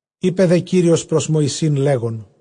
Εἶπε δὲ Κύριος πρὸς Μωυσῆν, λέγων,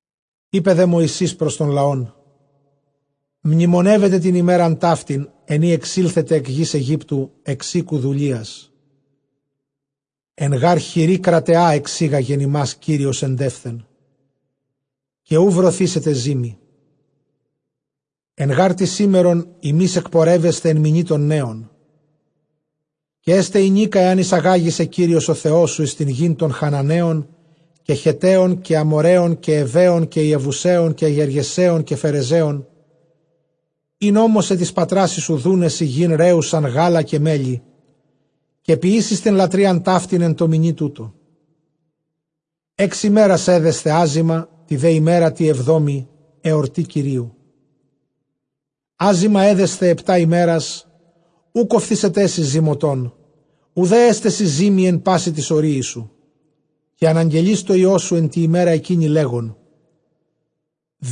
Εἶπε δὲ Μωυσῆς πρὸς τὸν λαὸν, μνημονεύετε τὴν ἡμέραν ταύτην, ἐν ᾗ ἐξήλθατε ἐκ γῆς Αἰγύπτου, ἐξ οἴκου δουλείας· ἐν γὰρ χειρὶ κραταιᾷ ἐξήγαγεν ὑμᾶς Κύριος ἐντεῦθεν· καὶ οὐ βρωθήσεται ζύμη. Ἐν γὰρ τῇ σήμερον ὑμεῖς ἐκπορεύεσθε ἐν μηνὶ τῶν νέων. Καὶ ἔσται ἡνίκα ἐὰν εἰσαγάγῃ σε Κύριος ὁ Θεός σου εἰς τὴν γῆν τῶν Χαναναίων, καὶ Χετταίων, καὶ Ἀμοῤῥαίων, καὶ Εὐαίων, καὶ Ἰεβουσαίων, καὶ Γεργεσαίων, καὶ Φερεζαίων, ἣν ὤμοσε τοῖς πατράσι σου, δοῦναί σοι γῆν ῥέουσαν γάλα καὶ μέλι· καὶ ποιήσεις τὴν λατρείαν ταύτην ἐν τῷ μηνὶ τούτῳ. Ἓξ ἡμέρας ἔδεσθε ἄζυμα, τῇ δὲ ἡμέρᾳ τῇ ἑβδόμῃ ἑορτὴ Κυρίου. Ἄζυμα ἔδεσθε ἑπτὰ ἡμέρας· οὐκ ὀφθήσεταί σοι ζυμωτὸν, οὐδὲ ἔσται σοι ζύμη ἐν πᾶσι τοῖς ὁρίοις σου. Καὶ ἀναγγελεῖς τῷ υἱῷ σου ἐν τῇ ἡμέρᾳ ἐκείνῃ, λέγων,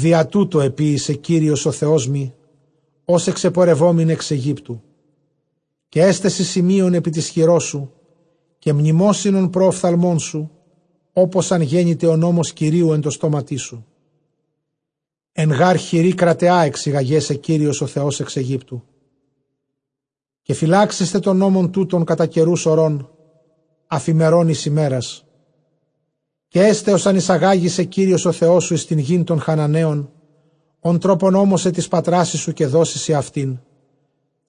διὰ τοῦτο ἐποίησε Κύριος ὁ Θεός μοι, ὡς ἐξεπορευόμην ἐξ Αἰγύπτου. Καὶ ἔσται σοι σημεῖον ἐπὶ τῆς χειρός σου, καὶ μνημόσυνον πρὸ ὀφθαλμῶν σου, ὅπως ἂν γένηται ὁ νόμος Κυρίου ἐν τῷ στόματί σου· ἐν γὰρ χειρὶ κραταιᾷ ἐξήγαγέ σε Κύριος ὁ Θεὸς ἐξ Αἰγύπτου. Καὶ φυλάξασθε τὸν νόμον τοῦτον κατὰ καιροὺς ὡρῶν, ἀφʼ ἡμερῶν εἰς ἡμέρας. Καὶ ἔσται ὡς ἂν εἰσαγάγῃ σε Κύριος ὁ Θεός σου εἰς τὴν γῆν τῶν Χαναναίων, ὃν τρόπον ὤμοσε τοῖς πατράσι σου, καὶ δώσει σοι αὐτήν.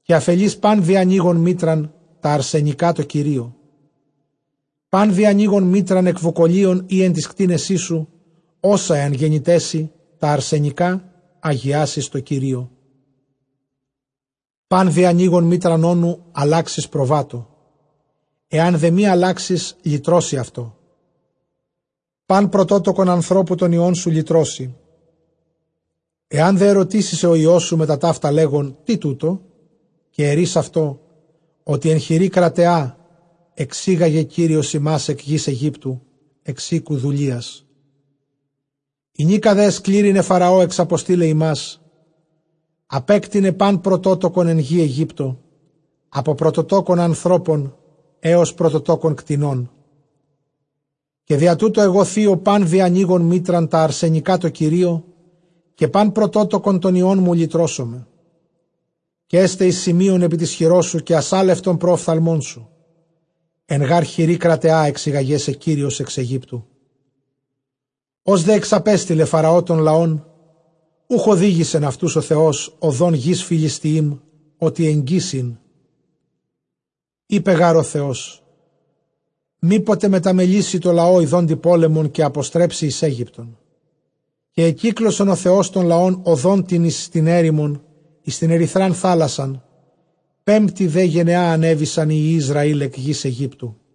Καὶ ἀφελεῖς πᾶν διανοῖγον μήτραν, τὰ ἀρσενικὰ τῷ Κυρίῳ· πᾶν διανοῖγον μήτραν ἐκ βουκολίων ἢ ἐν τοῖς κτήνεσί σου, ὅσα ἐὰν γένηταί σοι, τὰ ἀρσενικὰ ἁγιάσεις τῷ Κυρίῳ. Πᾶν διανοῖγον μήτραν ὄνου, ἀλλάξεις προβάτῳ· ἐὰν δὲ μὴ ἀλλάξῃς, λυτρώσῃ αὐτό· πᾶν πρωτότοκον ἀνθρώπου τῶν υἱῶν σου λυτρώσῃ. Ἐὰν δὲ ἐρωτήσῃ σε ὁ υἱός σου μετὰ ταῦτα, λέγων, τί τοῦτο; καὶ ἐρεῖς αὐτῷ, ὅτι ἐν χειρὶ κραταιᾷ ἐξήγαγεν Κύριος ἡμᾶς ἐκ γῆς Αἰγύπτου, ἐξ οἴκου δουλείας. Ἡνίκα δὲ ἐσκλήρυνε Φαραὼ ἐξαποστεῖλαι ἡμᾶς, ἀπέκτεινε πᾶν πρωτότοκον ἐν γῇ Αἰγύπτῳ, ἀπὸ πρωτοτόκων ἀνθρώπων ἕως πρωτοτόκων κτηνῶν· διὰ τοῦτο ἐγὼ θύω πᾶν διανοῖγον μήτραν, τὰ ἀρσενικὰ τῷ Κυρίῳ, καὶ πᾶν πρωτότοκον τῶν υἱῶν μου λυτρώσομαι. Καὶ ἔσται εἰς σημεῖον ἐπὶ τῆς χειρός σου, καὶ ἀσαλευτον πρὸ ὀφθαλμων σου· ἐν γὰρ χειρὶ κραταιᾷ ἐξήγαγέ σε Κύριος ἐξ Αἰγύπτου. Ὡς δὲ ἐξαπέστειλε Φαραὼ τὸν λαὸν, οὐχ ὡδήγησεν αὐτοὺς ὁ Θεὸς ὁδὸν γῆς· Φυλιστιεὶμ, ὅτι ἐγγὺς ἦν· εἶπε γὰρ ὁ Θεὸς, μήποτε μεταμελήσῃ τῷ λαῷ ἰδόντι πόλεμον, καὶ ἀποστρέψῃ εἰς Αἴγυπτον. Καὶ ἐκύκλωσεν ὁ Θεὸς τὸν λαὸν ὁδὸν τὴν εἰς τὴν ἔρημον, εἰς τὴν ἐρυθρὰν θάλασσαν· πέμπτῃ δὲ γενεᾷ ἀνέβησαν οἱ υἱοὶ Ἰσραὴλ ἐκ γῆς Αἰγύπτου.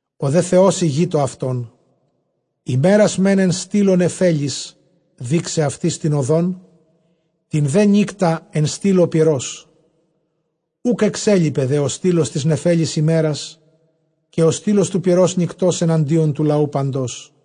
Ὁ δὲ Θεὸς ἡγεῖτο αὐτῶν, ἡμέρας μὲν ἐν στύλῳ νεφέλης, δεῖξαι αὐτοῖς τὴν ὁδόν· τὴν δὲ νύκτα ἐν στύλῳ πυρός. Οὐκ ἐξέλιπεν δὲ ὁ στύλος τῆς νεφέλης ἡμέρας, καὶ ὁ στύλος τοῦ πυρὸς νυκτὸς, ἐναντίον τοῦ λαοῦ παντός.